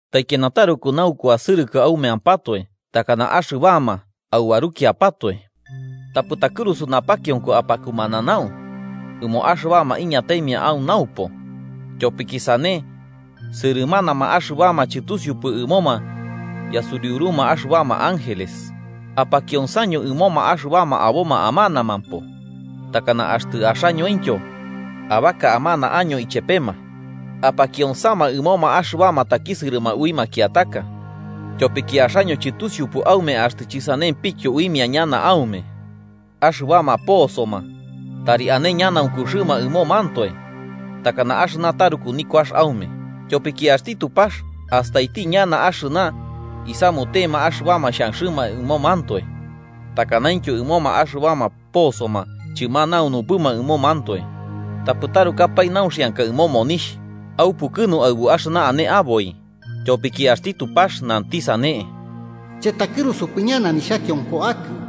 Taikiana taruku naukuasɨrɨkɨ aumeampatoe takana axɨbama aubarukiapatoe. Tapɨ takɨrusu napakionko apakumananau ɨmoma axɨbama iñataimia au naupo, tyopiki sane, sɨrɨmanama axɨbama chɨtusiupɨ ɨmoma yasuriuruma axɨbama ángeles. Apakionsaño ɨmoma axɨbama aboma amanamampo, takana axtɨ axañointyo abaka amana año ichepema. Apakionsama ɨmoma axɨbama takisɨrɨma ui makiataka, tyopiki axaño chɨtusiupɨ aume axtɨ chɨsanempityo uimia ñana aume. Axɨbama posoma tari ane ñanaunkuxɨma ɨmomantoe takana axɨna taruku nikuax aume. Tyopiki axti Tupax astaiti ñana axɨna isamutema axɨbama xhanxɨma ɨmomantoe takanaintyo ɨmoma axɨbama posoma chɨmanuanupɨma ɨmomantoe. Tapɨ tarukapae nauxianka ɨmo monixh. Aupukɨnu aɨbu axɨna ane aboi, tyopiki axti Tupax nanti sane: “Chɨtakɨrusupɨ ñana nixhakionko akɨ.”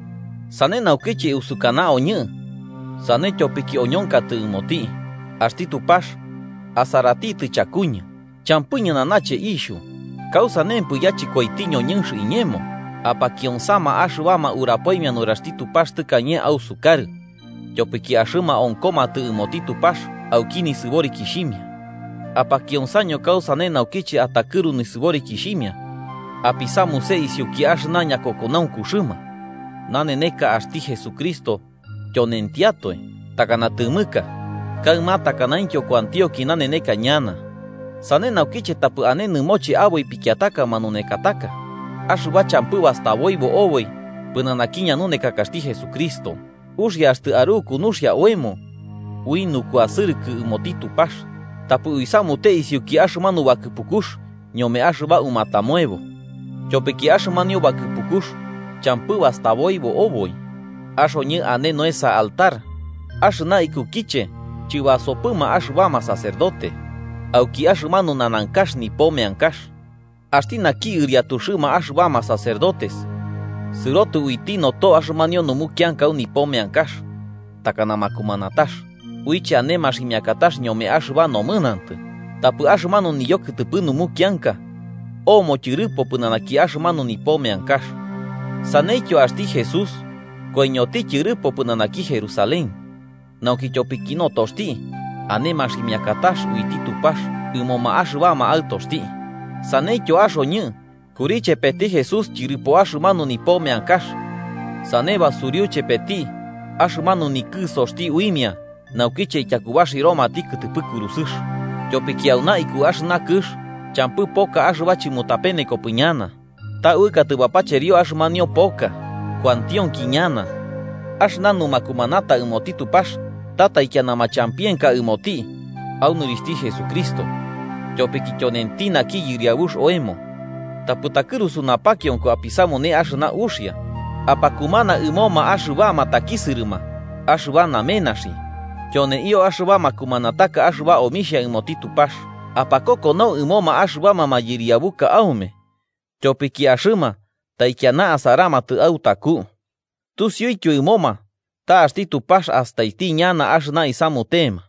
Sane naukiche usukana oñɨ sane tyopiki oñonkatɨ ɨmoti: Axti Tupax asaratitɨ chakuñɨ. Champɨ ñɨnanache ixhu. ¿Kausanempɨ yachɨkoiti ñoñɨnx iñemo? Apakionsama axɨbama urapoimia nuraxti Tupax tɨkañe ausukarɨ, tyopiki axɨma onkomatɨ ɨmoti Tupax auki nisɨborikixhimia. Apakionsaño kausane naukiche atakɨru nisɨborikixhimia, apisamuse isiuki axɨna ñakokonaunkuxɨma. Naneneka axti Jesucristo tyonentiatoe, takana tɨmɨka, kaɨma takanaintyo kuantionki naneneka ñana. Sane naukiche tapɨ ane nɨmoche aboi pikiataka manunekataka, axɨba champɨ bastaboibo oboi pɨnanaki ñanunekakaxti Jesucristo. Uxia axtɨ aruku nuxia oemo ui nukuasɨrɨkɨ ɨmoti Tupax, tapɨ uisamute isiuki axɨmanu bakɨpukux ñome axɨba umatamoebo. Tyopiki axɨmanio bakɨpukux champɨ bastaboibo oboi. Axoñɨ ane noesa altar, axɨna ikukiche chɨbasopɨma axɨbama sacerdote auki axɨmanu nanankax nipo meankax. Axti naki ɨriatuxɨma axɨbama sacerdotes sɨrotɨ uiti noto axɨmanio numukianka au nipo meankax, takana makumanatax uiche ane maximiakatax ñome axɨba nomɨnantɨ, tapɨ axɨmanu niyokɨtɨpɨ numukianka omo tyɨrɨpo pɨnanaki axɨmanu nipo meankax. Saneityo axti Jesús koiñoti tyɨrɨpo pɨnanaki Jerusalén, nauki tyopiki notoxti, ane maximiakatax uiti Tupax ɨmoma axɨbama aɨtoxti. Saneityo axoñɨ kuri chepeti Jesús tyɨrɨpo axɨmanu nipo meankax sane basuriu chepeti axɨmanu nikɨsoxti uimia naukiche ityakubaxiromati kɨtɨpɨ kurusɨx. Tyopiki auna iku axɨna kɨx champɨ poka axɨba chɨmutapenekopɨ ñana, ta uɨkatɨ bapacherio axɨmanio poka kuantionki ñana. Axɨna numakumanata ɨmoti Tupax ta taikiana machampienka ɨmoti au nɨrixhti Jesucristo, tyopiki tyonenti naki Yɨriabux oemo. Tapɨ takɨrusu napakionko apisamune axɨna uxia, apakumana ɨmoma axɨbama takisɨrɨma axɨba namenaxi. Tyoneio axɨba makumanataka axɨba omixhia ɨmoti Tupax. Apakokonau ɨmoma axɨbama mayɨriabuka aume, tyopiki axɨma taikiana asaramatɨ autaku, tusiuityo ɨmoma ta axti Tupax astaiti ñana axɨna isamutema.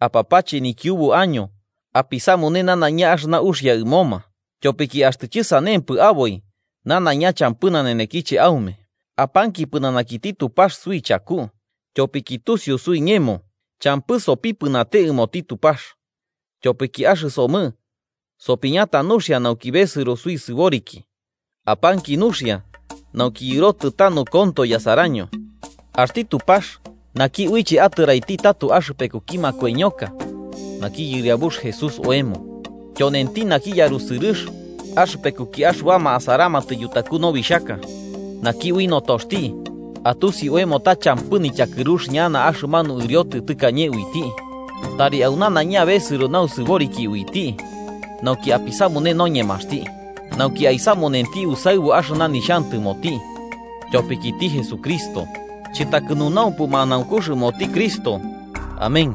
Apapache nikiubu año apisamune nanaiña axɨna uxia ɨmoma, tyopiki axtɨ chɨsanempɨ aboi nanaiña champɨ nanenekiche aume. Apanki pɨnanakiti Tupax suichaku, tyopiki tusiu suiñemo champɨ sopipɨnate ɨmoti Tupax, tyopiki axɨsomɨ sopiñata nuxia nauki besɨro suisɨboriki. Apanki nuxia nauki yɨrotɨ tanu konto yasaraño. Axti Tupax, naki uiche atɨraiti tato axɨpekuki makoiñoka naki Yɨriabux Jesús oemo, tyonenti naki yarusɨrɨx axɨpekuki axɨbama asaramatɨ yutaku nobixhaka, naki ui notoxti atusi oemo ta champɨ nityakɨrux ñana axɨmanu ɨriotɨ tɨkañe uiti, tari au nanaiña besɨro nausɨboriki uiti, nauki apisamune noñemaxti. Nauki aisamunenti usaɨbu axɨna nixhantɨmoti, tyopikiti Jesucristo. ¡Chɨtakɨnunaumpɨ manaunkux ɨmoti Cristo! Amén.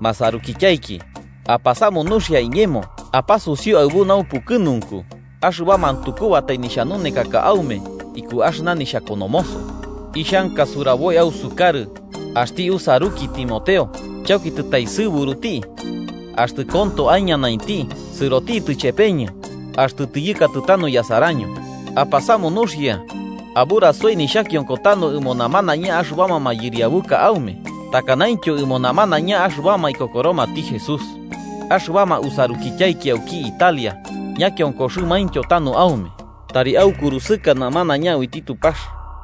Masarukityaiki, apasamu nuxia iñemo apasusiu aɨbu naupukɨnunku axɨba mantukubatai nixhanunekaka aume iku axɨna nixhakonomoso. Ixhanka suraboi ausukarɨ axti usaruki Timoteo chauki tɨtaesɨburuti, axtɨ konto aiñanainti, sɨrotitɨ chepeñɨ axtɨ tiyɨkatɨ tanu yasaraño. Apasamu nuxia aburasoi nixhakionko tanu ɨmo namanaiña axɨbama mayɨriabuka aume, takanaintyo ɨmo namanaiña axɨbama ikokoromati Jesús. Axɨbama usarukityaiki auki Italia ñakionkoxɨmaintyo tanu aume. Tari aukurusɨka namanaiña uiti Tupax.